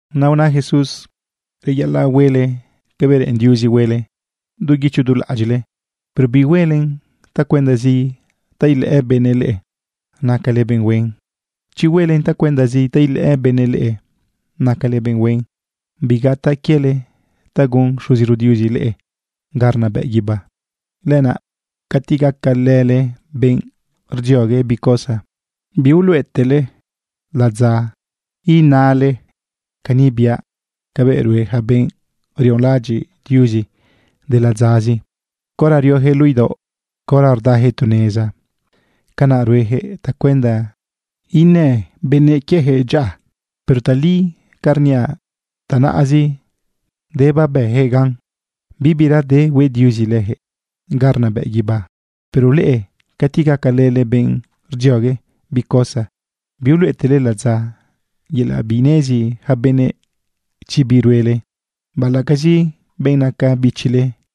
Naꞌ una Jesús: ―Reyaꞌalaꞌ huele cabëꞌ reꞌen Diuzi huele du guicho du laꞌadyiꞌle, pero bihuelen tacuendazi ta ilëꞌë benëꞌ leꞌe nacale benꞌ huen. Chi huelen tacuendazi ta ilëꞌë benëꞌ leꞌe nacale benꞌ huen, bigataꞌ quiele ta gun Xuziro Diuzi leꞌe ga rnabëꞌ guibá. Lenaꞌ cati gacalële benꞌ rdziogue bi cosa, biuluꞌetele ladza inale cani biaꞌ cabëꞌ rue ja benꞌ rionlaꞌadyiꞌ Diuzi de ladzazi caora riojëꞌ luꞌu idaoꞌ, caora rdajëꞌ tu neza. Canaꞌ ruejëꞌ tacuenda inë benëꞌ quiejëꞌ dyaꞌa. Pero tali ca rniaꞌ, tanaꞌzi de babëjëꞌ gan, bibira de hueꞌ Diuzi lëjëꞌ ga rnabëꞌ guibá. Pero leꞌe cati gacalële benꞌ rdziogue bi cosa, biuluꞌetele ladza yelaꞌ binezi ja benëꞌ chi bi ruele, baꞌalaꞌcazi benꞌ naca bichile.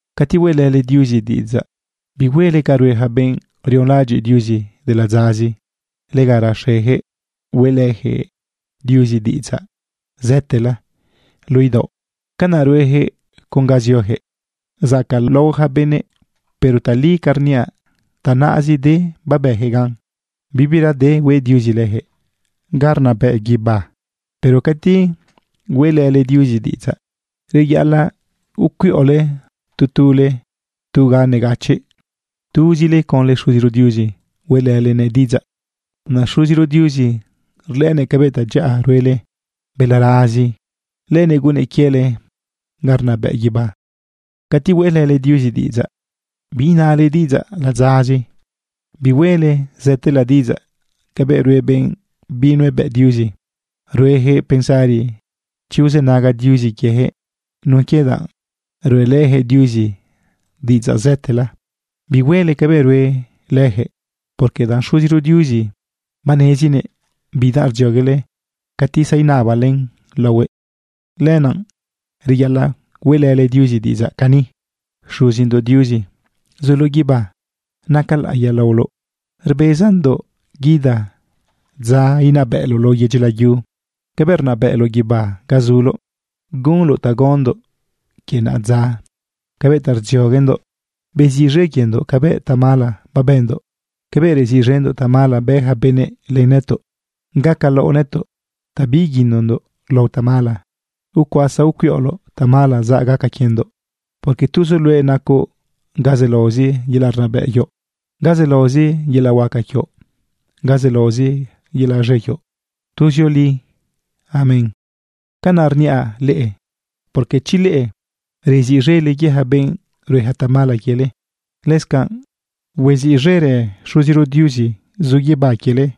―Cati hueꞌlële Diuzi diꞌidzaꞌ, bihuele ca rue ja benꞌ rionlaꞌadyiꞌ Diuzi de ladzazi. Lega raxejëꞌ hueꞌlëjëꞌ Diuzi diꞌidzaꞌ zëtela luꞌu idaoꞌ. Canaꞌ ruejëꞌ con ga ziojëꞌ zacaꞌlao ja benëꞌ. Pero tali ca rniaꞌ, tanaꞌzi de babëjëꞌ ganꞌ. Bibira de hueꞌ Diuzi lëjëꞌ ga rnabëꞌ guibá. Pero cati hueꞌlële Diuzi diꞌidzaꞌ, reyaꞌalaꞌ ucuiꞌole tu tule tu ga negachiꞌ. Tuzile conlë Xuziro Diuzi hueꞌlëlenëꞌ diꞌidzaꞌ. Naꞌ Xuziro Diuzi rlëꞌënëꞌ cabëꞌ tadyaꞌa ruele balarazi, lënëꞌ gunnëꞌ quiele ga rnabëꞌ guibá. ’Cati hueꞌlële Diuzi diꞌidzaꞌ, biinale diꞌidzaꞌ ladzazi, bihuele zëtela diꞌidzaꞌ cabëꞌ rue benꞌ binuebëꞌ Diuzi. Ruejëꞌ pensari chi uzënaga Diuzi quiejëꞌ nun quie danꞌ ruꞌelëjëꞌ Diuzi diꞌidzaꞌ zëtela. Bihuele cabëꞌ rue lëjëꞌ, porque danꞌ Xuziro Diuzi banezinëꞌ bidanꞌ rdzioguele cati zainabale laohuëꞌ. Lenaꞌ reyaꞌalaꞌ hueꞌlële Diuzi diꞌidzaꞌ cani: Xuzindoꞌ Diuzi zuloꞌ guibá, naca laꞌiya laoloꞌ. Rbezandoꞌ guida dza inabëꞌloꞌ lao yedyi layu cabëꞌ rnabëꞌloꞌ guibá ga zuloꞌ. Gunoꞌ ta gaondoꞌ quie naꞌadza cabëꞌ ta rdzioguendoꞌ. Beziꞌz̃e quiendoꞌ cabëꞌ tamala babëndoꞌ cabëꞌ reziꞌz̃endoꞌ tamala bë ja benëꞌ len nëtoꞌ. Gacalaoꞌ nëtoꞌ ta biiguinondoꞌ lao tamala, ucuasa ucuiꞌoloꞌ tamala zaꞌ gaca quiendoꞌ. Porque tuzoꞌ luëꞌ nacoꞌ ga zelaozi yelaꞌ rnabëꞌ quioꞌ, ga zelaozi yelaꞌ huaca quioꞌ, ga zelaozi yelaꞌ z̃e quioꞌ tuzioli. Amén. ’Canaꞌ rniaꞌ leꞌe porque chi leꞌe rziꞌz̃ele quie ja benꞌ rueja tamala quiele, lëscanaꞌ huaziꞌz̃erë Xuziro Diuzi zu guibá quiele.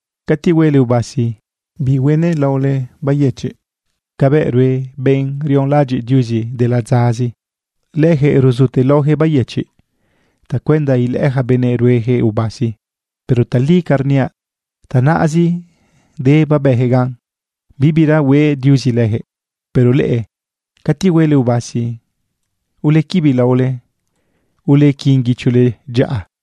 ―Cati huele ubasi, bihuenëlaole bayëchiꞌ cabëꞌ rue benꞌ rionlaꞌadyiꞌ Diuzi de ladzazi. Lëjëꞌ ruzutelaojëꞌ bayëchiꞌ tacuenda ilëꞌë ja benëꞌ ruejëꞌ ubasi. Pero tali ca rniaꞌ, tanaꞌzi de babëjëꞌ gan, bibira hueꞌ Diuzi lëjëꞌ. Pero leꞌe cati huele ubasi, ulequibi laole, ulequin guichole dyaꞌa.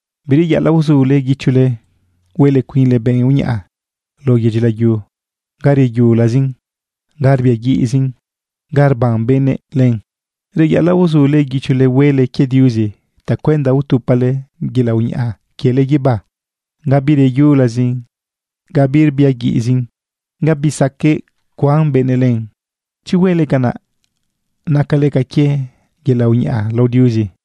―Bireyaꞌalaꞌ uzule guichole huele cuinle benꞌ uñaꞌa lao yedyi layu ga reyulazin, ga rbiaguiꞌzin, ga rban benëꞌ len. Reyaꞌalaꞌ uzule guichole huele quie Diuzi tacuenda utupale yelaꞌ uñaꞌa quiele guibá ga bireyulazin, ga birbiaguiꞌzin, ga bisaqueꞌ cuan benëꞌ len. Chi huele canaꞌ, nacale ca quie yelaꞌ uñaꞌa lao Diuzi.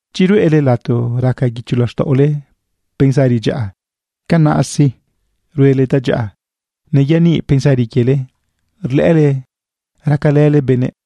―Chi ruꞌele lato raca guicho laxtaꞌole pensari dyaꞌa, canaꞌ sí, ruele tadyaꞌa, neyaniꞌ pensari quiele rlëꞌële racalële benëꞌ.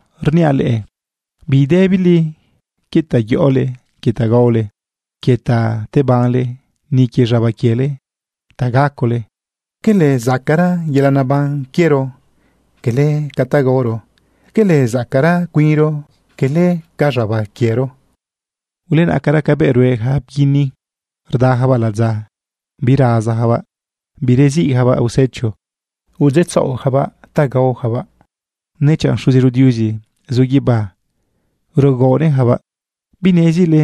―Rniaꞌ leꞌe, bidëbile quie ta yoꞌole, quie ta gaole, quie ta tebanle, ni quie z̃aba quiele ta gacole. ¿Quele zacaꞌra yelaꞌ neban quiero quele ca ta gaoro? ¿Quele zacaꞌra cuinro quele ca z̃aba quiero? Ulenaꞌcara cabëꞌ rue ja bguini rdajabaꞌ ladza. Birazajabaꞌ, bireziꞌjabaꞌ usecho udzeꞌtzaꞌojabaꞌ gaojabaꞌ, nechanꞌ Xuziro Diuzi zu guibá rugaonëꞌjabaꞌ. ¿Binezile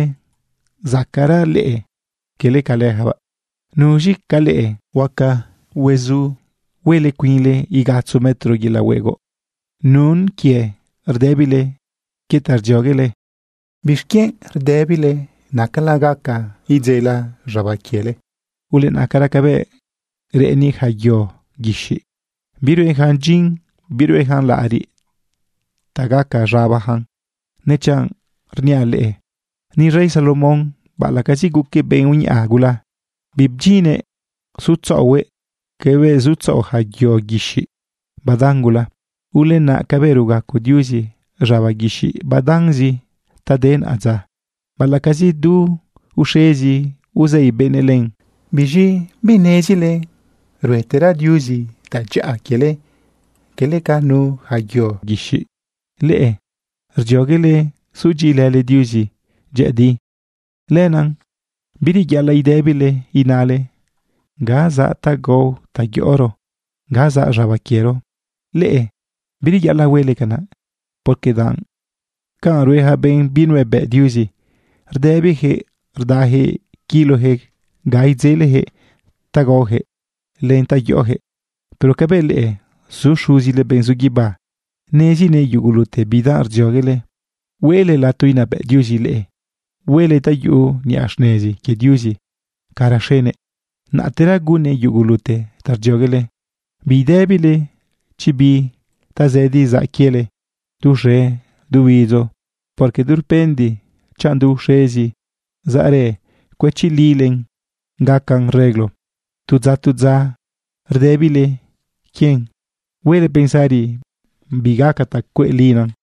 zacaꞌra leꞌe quele ca lëjabaꞌ? ¿Nuz̃i ca leꞌe huaca huezu huele cuinle igatzo metro yelaꞌ huegoꞌ nun quie rdëbile quie ta rdzioguele? ’¿Bixquienꞌ rdëbile nacala gaca idzela z̃aba quiele? Ulenaꞌcara cabëꞌ reꞌeni ja yo guixiꞌ. Biruejan dyin, biruejan laꞌariꞌ ta gaca z̃abajan. Nechanꞌ rniaꞌ leꞌe, ni rey Salomón, baꞌalaꞌcazi guquëꞌ benꞌ uñaꞌa gula, bibdyinnëꞌ sutzaꞌohuëꞌ cabëꞌ zutzaꞌo ja yo guixiꞌ badan gula. Ulenaꞌ cabëꞌ rugaco Diuzi z̃aba guixiꞌ badanzi ta de naꞌadza, baꞌalaꞌcazi du uxezi uzei benëꞌ len, ¿biz̃i binezile ruetera Diuzi tadyaꞌa quiele quele ca nu ja yo guixiꞌ? Leꞌe rdzioguele sudyiꞌilële Diuzi dyëꞌëdi. Lenaꞌ bireyaꞌalaꞌ idëbile inale: “¿Ga zaꞌ ta gao ta yoꞌoro? ¿Ga zaꞌ z̃aba quiero?” Leꞌe bireyaꞌalaꞌ huele canaꞌ, porque danꞌ canꞌ rue ja benꞌ binuebëꞌ Diuzi. Rdëbijëꞌ rdajëꞌ quilojëꞌ ga idzelejëꞌ ta gaojëꞌ len ta yoꞌojëꞌ. Pero cabëꞌ leꞌe, zu Xuzile benꞌ zu guibá, nezinëꞌ yugulute bidanꞌ rdzioguele. Hueꞌle lato inabëꞌ Diuzi leꞌe, huele ta yuꞌu niꞌa xnezi quie Diuzi ca raxenëꞌ. Naꞌtera gunnëꞌ yugulute ta rdzioguele. Bidëbile chi bi tazëdi zaꞌ quiele du uxe du huidzo, porque durpende chanꞌ du uxezi zaꞌrë cuëchilile gacan reglo. Tu dza tu dza rdëbile quien, huele pensari bi gaca ta cueꞌlina.